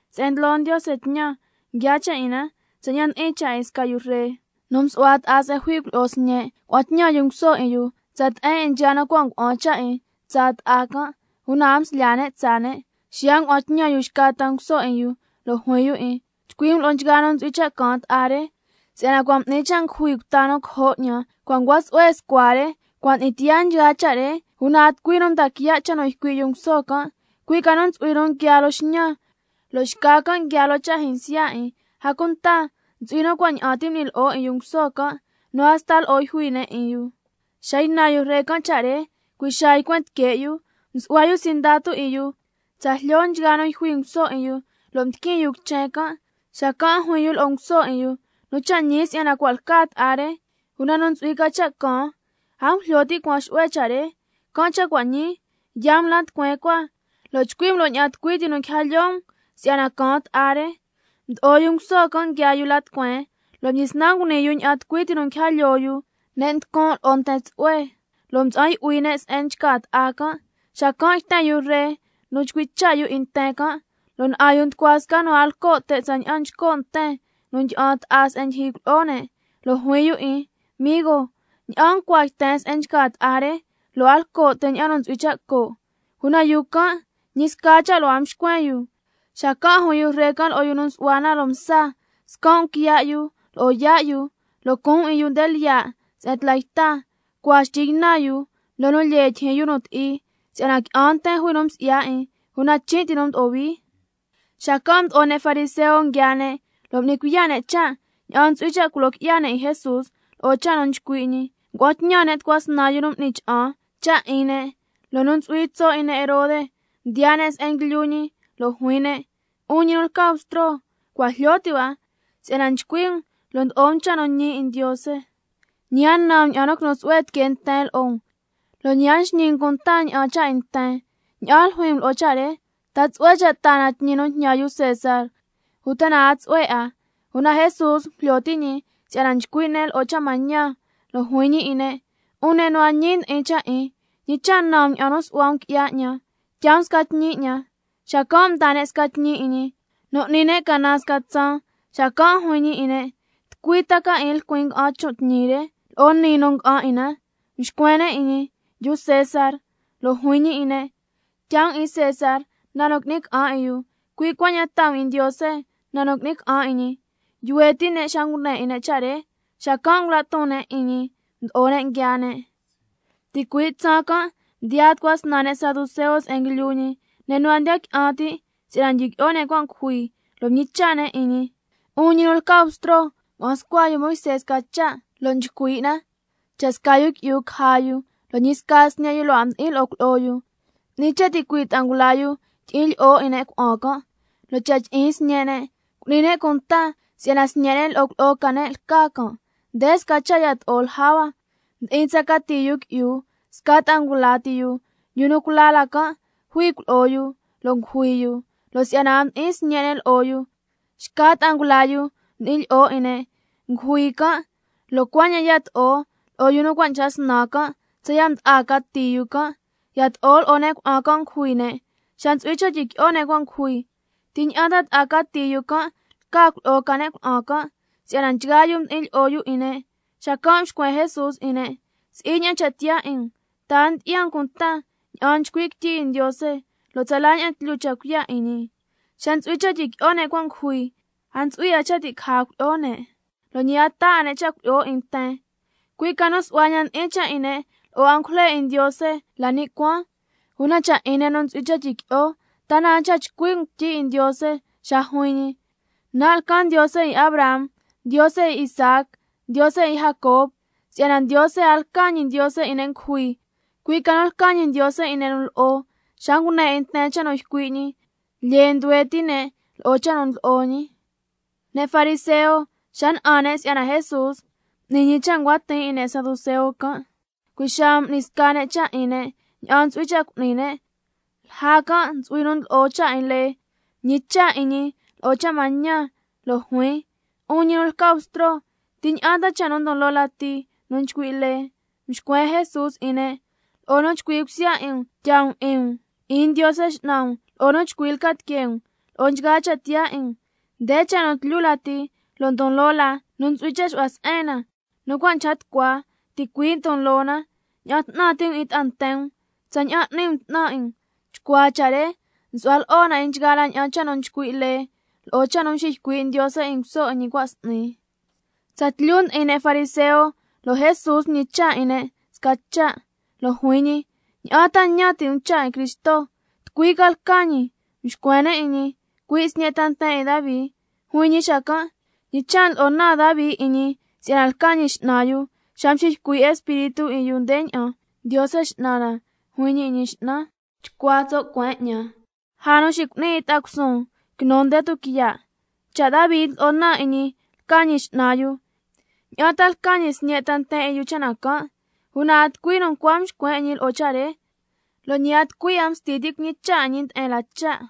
Se'en ndlo Ndiose tñan, nguiaa cha' 'in na tsaña'an ndi'in cha' 'in sca yu ree nu msu'hua ta'a se'en jui cuilyi'o sñe'. Xacan' ngua'an tñan yu nguso 'in yu tsa te'en 'in nchgaa nu cua' ngua'an cha' 'in tsaa ta'a can', una a mslyaa ne' tsaa ne'. Xiya' ngua'an tñan yu xca ta nguso 'in yu, lo' juin yu 'in: Chcui' um lo'o nchgaa nu ntsu'hui cha' caan ta'a re, si'yana cua' m'ni cha' ngujui 'ni lo'o bta cojo' 'ñan, cua' ncua tsu'hue scua re, cua' ndi'in tiyaa nchgaa cha' re. Una a tucui nu mdaa quiya' cha' nu ycui' yu nguso can', cui' ca nu ntsu'hui nu nguiaa loo xñan, lo' xca can' nguiaa loo cha' jyinsya 'in. A cunta ntsu'hui nu cua' ña'an ti m'ni lyi'o 'in yu nguso can', nu hasta lo'o yjui ne' 'in yu. Xa ynan yu ree can' cha' re, cui' xaa ycuen tique' yu, msu'hua yu sindatu 'in yu tsa jlyo nchgaa nu yjui nguso 'in yu, lo' mdiquin yu quichen can'. Xacan' juin yu lo'o nguso 'in yu: Nu cha' ñi si'yana cua' lca ta'a re, una nu ntsu'hui ca cha' caan, a ngujlyo ti' cuan xu'hue cha' re. Can' cha' cua' ñii, yaa um la tucueen cua, lo' chcui' um lo'o ña'an tucui ti nu quija lyoo um si'yana caan ta'a re. Mdo'o yu nguso can' nguiaa yu la tucueen, lo' mdyisnan nguni yu ña'an tucui ti nu nguija lyoo yu, ne' nducun' lo'o nten tsu'hue, lo' mtsa'an yu'hui ne' se'en nchca ta'a can'. Xacan' yten yu ree can' nu chcui' cha' yu 'in nten can', can' na'an yu nducua sca nu a lco' te', tsaña'an nchco' nten nu ndyi'an ta'a se'en ndyijyi cuilyi'o ne'. Lo' juin yu 'in: Migo, ¿ña'an ncua yten se'en nchca ta'a re, lo' a lco' te' ña'an nu ntsu'hui cha' co'? Una yu can', ñi sca cha' lo' a mxcuen yu. Xacan' juin yu ree can' lo'o yu nu nsu'hua na loo msa: Scan' um quiya' yu lo'o yaa' yu, lo' cuun 'in yu nde lyiya' se'en tla yta, cua xtyi ynan yu loo nu lyee tyijyin yu nu ti'i. Si'yana qui'an nten jui nu msi'ya 'in, una chin' ti nu mdo'o hui. Xacan' mdo'o ne' fariseo nguiaa ne', lo' m'ni cuiya' ne' cha' ña'an ntsu'hui cha' culo qui'ya ne' 'in Jesús lo'o cha' nu chcui' ñi. Ngua'an tñan ne' tucua snan yu nu m'ni cha'an cha' 'in ne', lo'o nu ntsu'hui tso' 'in ne' Herode, mdiyaa ne' se'en nguilyu ñi lo' juin ne': 'Un ñi nu lca Bstro, cua' jlyo ti' hua si'yana nchcui' um lo' ndlo'o um cha' nu ñi 'in Ndiose, ñi a nan um ña'an nu quinu tsu'hue tiquee nten lo'o um, lo' ñi a nxñi um cunta ña'an cha' 'in nten. ¿Ña'an ljuin um lo'o cha' re, ta tsu'hue cha' ti' taa na tñi nu njñan yu César, uta na a tsu'hue 'a? Una Jesús ngujlyo ti' ñi si'yana nchcui' ne' lo'o cha' mañan, lo' juin ñi 'in ne': 'Un ne' nu a ñi ndi'in cha' 'in, ¿ñi cha' nan um ña'an nu su'hua um qui'ya 'ñan? Tyaa um sca tñi 'ñan. Xacan' mdaa ne' sca tñi 'in ñi, nu n'ni ne' canan sca tsaan. Xacan' juin ñi 'in ne': ¿Tucui ta 'in lcuin nga'an chon' tñi re, lo'o niin nu nga'an 'in na? Mxcuen ne' 'in ñi: Yu César. Lo' juin ñi 'in ne': Can' cha' tyaa um 'in César na nu qui'ni ca'an 'in yu, cui' cuaña'an tyaa um 'in Ndiose na nu qui'ni ca'an 'in ñi. Yuhue' ti' ne' xa ngune 'in ne' cha' re, xacan' ngula' ton ne' 'in ñi, mdo'o ne' nguiaa ne'. Ticui' tsaan can' mdiyaa tucua snan ne' saduceo se'en nguilyu ñi, ne' nu a ndiya qui'an ti' si'yana ndyiqui'o ne' cua' ngujui, lo' mñicha' ne' 'in ñi: 'Un ñi nu lca Bstro, ngua'an scua yu Moisé sca cha' lo' nchcui' na: —Cha' sca yu qui'yu caja yu, lo' ñi sca sñe' yu lo' a mdi'in lo'o cuilyi'o yu, 'ni cha' ticui' ta'a ngula yu tyi'in lyi'o 'in ne' cuna'an can', lo' cha' tyi'in sñe' ne', cu'ni ne' cunta si'yana sñe' ne' lo'o cuilyi'o ca ne' lca can'—. Nde sca cha' yato'o lja hua, mdi'in tsa cati yu qui'yu, sca ta'a ngula ti yu. Yu nu cula la can' jui cuilyi'o yu, lo' ngujui yu, lo' si'yana a mdi'in sñe' ne' lo'o yu, xca ta'a ngula yu mdi'in lyi'o 'in ne'. Ngujui can', lo' cuaña'an yato'o lo'o nu cua' nchca snan can' tsaya' mda'a cati yu can'. Yato'o lo'o ne' cuna'an can' ngujui ne'. Xa ntsu'hui cha' tyiqui'o ne' cua' ngujui, ¿ti ña'an ta'a cati yu can' lca cuilyi'o ca ne' cuna'an can', si'yana nchgaa yu mdi'in lyi'o yu 'in ne'? Xacan' mxcuen Jesús 'in ne': Si'i ña'an cha' tiyaa 'in um, ¿ta na a ndyi'ya um cunta ña'an nchcui' quityi 'in Ndiose, lo' tsala ña'an tlyu cha' cuiya' 'in ñi? Xa ntsu'hui cha' tyiqui'o ne' cua' ngujui, a ntsu'hui 'a cha' ti' caja cuilyi'o ne', lo' ñi a taa 'a ne' cha' cuilyi'o 'in nten, cui' ca nu su'hua ña'an ndi'in cha' 'in ne' lo'o angujle 'in Ndiose la ni' cuaan. Una cha' 'in ne' nu ntsu'hui cha' tyiqui'o, ¿ta na a nchca chcui' um quityi 'in Ndiose xa juin ñi: —Nan' lcan Ndiose 'in Abraham, Ndiose 'in Isaac, Ndiose 'in Jacob—? Si'yana Ndiose a lca ñi Ndiose 'in ne' ngujui, cui' ca nu lca ñi Ndiose 'in ne' nu lo'o. Xa ngune 'in nten cha' nu ycui' ñi, lyee nduhue ti' ne' lo'o cha' nu ndlo'o ñi. Ne' fariseo xa na'an ne' si'yana Jesús m'ni ñi cha' ncua tiin 'in ne' saduceo can', cui' xaa m'ni sca ne' cha' 'in ne' ña'an ntsu'hui cha' cu'ni ne'. Lja can' ntsu'hui nu ndlo'o cha' 'in lee, mñicha' 'in ñi lo'o cha' mañan, lo' juin: 'Un ñi nu lca Bstro, ¿ti ña'an ta cha' nu ndon loo lati nu nchcui' lee? Mxcuen Jesús 'in ne': —Lo'o nu chcui cusya 'in um tyaa um 'in um 'in Ndiose X'nan um, lo'o nu chcui lca tiquee um—, lo'o nchgaa cha' tiyaa 'in um. Nde cha' nu tlyu lati lo' ndon loo la nu ntsu'hui cha' xu'hua se'en na. Nu cua' nchca tucua ticui' ndon loo na: —Ña'an 'tnan ti' um 'in ta'a nten um tsaña'an n'ni um 'tnan 'in um—. Chcuaa cha' re nsu'hua lo'o na 'in nchgaa la ña'an cha' nu nchcui' lee, lo'o cha' nu mxiycui' Ndiose 'in nguso 'in ñi cua' sñi. Tsatlyu ndi'in ne' fariseo, lo' Jesús mñicha' ñi 'in ne' sca cha', lo' juin ñi: ¿Ña'an ta ñan ti' um cha' 'in Cristo? ¿Tucui ta lca ñi? Mxcuen ne' 'in ñi: Cui' sñe' ta nten 'in Davi. Juin ñi xacan': ¿Ñi cha' ndlo'o naan Davi 'in ñi si'yana lca ñi X'nan yu, xa mxiycui' Espíritu 'in yu ndeña'an: —Ndiose X'nan na juin ñi lo'o Ñi X'nan: Chcua tso' cueen 'ñan lja xicu'nin 'in ta'a cusuun quinu nde tuquiya'—? Cha' Davi ndlo'o naan yu 'in ñi lca ñi X'nan yu, ¿ña'an ta lca ñi sñe' ta nten 'in yu cha' na can'? Una a tucui nu ncua mxcuen 'in ñi lo'o cha' re, lo' ñi a tucui 'a msti ti' cuñicha' 'in ñi nde'en la cha'.